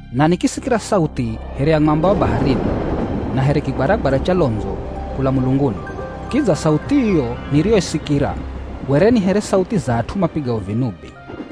Na nikisikira sauthi here ya mwamba wa baharini na here kigwaragwara cha londzo kula mulunguni. Kidza sauthi iyo niriyoisikira were ni here sauthi za at'u mapigao vinubi.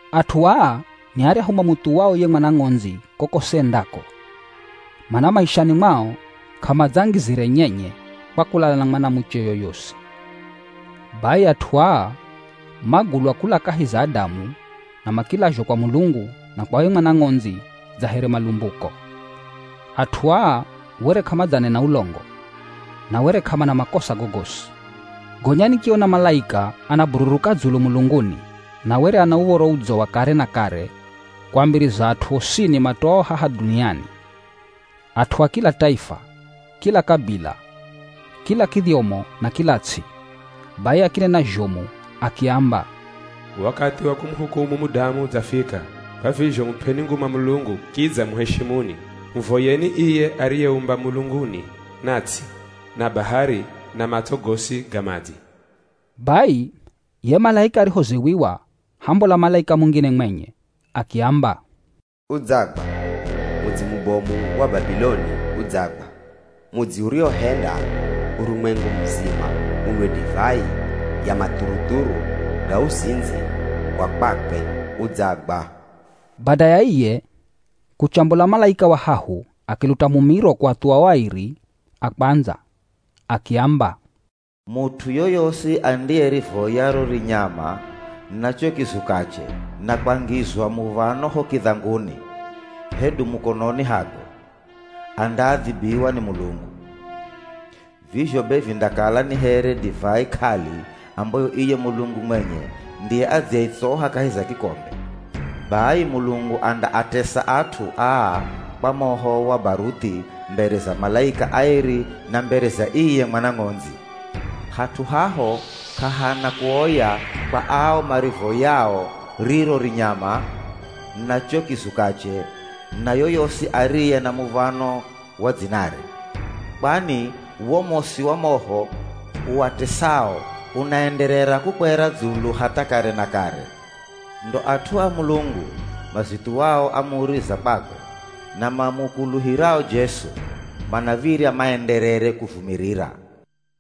At'u aa ni aryahu mamuthuwao ye Mwana Ng'ondzi kokosi endako. Mana maishani mwao k'amadzangizire nyenye kwa kulala na mwanamuche yoyosi. Bai at'u aa magulwa kula kahi za adamu na makilazhwa kwa Mulungu na kwa ye Mwana Ng'ondzi dza here malumbuko. At'u aa were k'amadzanena ulongo, na were k'amana makosa gogosi. Gonya nikiona malaika anabururuka dzulu mulunguni na were ana Uv̱oro Udzo wa kare na kare kuambiriza at'u osini matoao haha dhuniani, at'u a kila taifa, kila kabila, kila kidhyomo na kila ts'i. Bai akinena zhomu akiamba, “Wakathi wa kumuhukumu mudamu udzafika. Kwa vizho mup'eni nguma Mulungu kidza muheshimuni. Muvoyeni iye ariyeumba mulunguni na ts'i, na bahari, na matso gosi ga madzi.” Bai ye malaika arihoziwiwa hambola malaika mungine mwenye akiamba, “Udzagwa! Mudzi mubomu wa Babiloni, udzagwa! Mudzi uriwohenda urumwengu muzima unwe divai ya mathuruthuru ga uzindzi wa kwakwe, udzagwa!” Bada ya iye, kuchambola malaika wa hahu akiluta mumiro kuathuwa o airi a kwandza akiamba, “Mut'u yoyosi andiyerivoya ro rinyama na cho kizukache, na kwangizwa muv̱ano ho kidhanguni hedu mukononi hakwe, andaadhibiwa ni Mulungu. Vizho be vindakala ni here divai k'ali ambayo iye Mulungu mwenye ndiye adziyeitsoha kahi za kikombe. Bai Mulungu andaatesa at'u aa kwa moho wa baruthi mbere za malaika aeri na mbere za iye Mwana Ng'ondzi. Hat'u haho k'ahana kuoya kwa ao marivoyao riro rinyama na cho kizukache na yoyosi ariye na muv̱ano wa dzinare. Kwani wo mosi wa moho uatesao unaenderera kukwera dzulu hatha kare na kare.” Ndo at'u a Mulungu, mazithuwao amuri za kwakwe na mamukuluhirao Jesu, manav̱irya maenderere kuvumirira.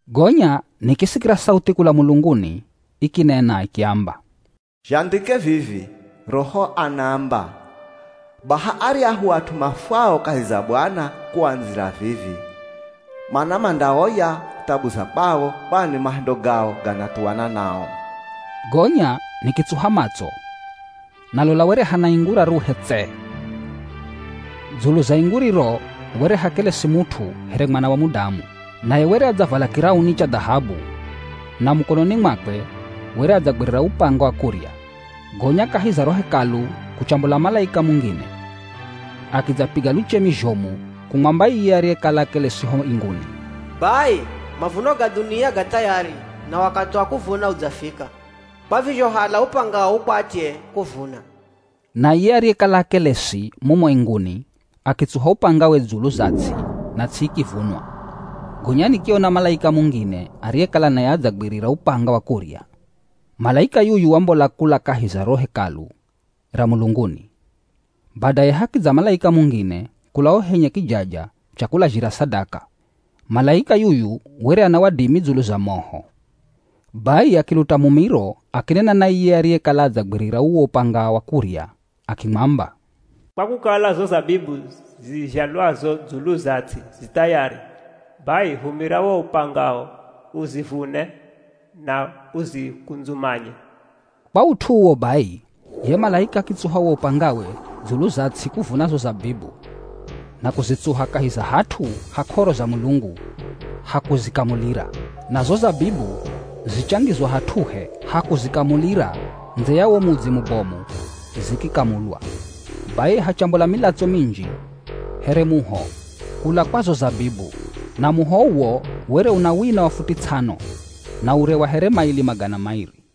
Gonya nikisikira sauthi kula mulunguni ikinena ikiamba, “Zhandhike vivi, Roho anaamba, ‘Baha aryahu at'u mafwao kahi za Bwana kuandzira vivi, mana mandaoya thabu za kwao, kwani mahendo gao ganathuwana nao.’” Gonya nikitsuha matso, na lola were hana ingu raruhe tse. Dzulu za ingu riro were hakelesi mut'u here Mwana wa Mudamu. Naye were adzavala kirauni cha dhahabu na mukononi mwakwe were adzagwirira upanga wa kurya. Gonya kahi za ro Hekalu kuchambola malaika mungine akidzapiga luchemi zhomu kumwamba iye ariyekala akelesi ho inguni, “Bai mavuno ga dhunia ga thayari na wakathi wa kuvuna udzafika, kwa vizho hala upangao ukwatye kuvuna.” Na iye ariyekala akelesi mumo inguni akitsuha upangawe dzulu za ts'i na ts'i ikivunwa. Gonya nikiona malaika mungine ariyekala naye adzagwirira upanga wa kurya. Malaika yuyu wambola kula kahi za ro Hekalu ra mulunguni. Badaye hakidza malaika mungine kula ho henye kijaja cha kulazhira sadaka. Malaika yuyu were ana wadimi dzulu za moho. Bai akiluta mumiro akinena na iye ariyekala adzagwirira uwo upanga wa kurya akimwamba, “Kwa kukala zo zabibu zizhalwazo dzulu za ts'i zi thayari, bai humira wo upangao uzivune na uzikundzumanye.” Kwa ut'u uwo bai, ye malaika akitsuha wo upangawe dzulu za ts'i kuvuna zo zabibu na kuzitsuha kahi za hat'u ha k'oro za Mulungu ha kuzikamulira. Na zo zabibu zichangizwa hat'uhe ha kuzikamulira ndze ya wo mudzi mubomu zikikamulwa. Bai hachambola milatso minji here muho kula kwa zo zabibu. Na muho uwo were una wina wa futi ts'ano, na ure wa here maili magana mairi.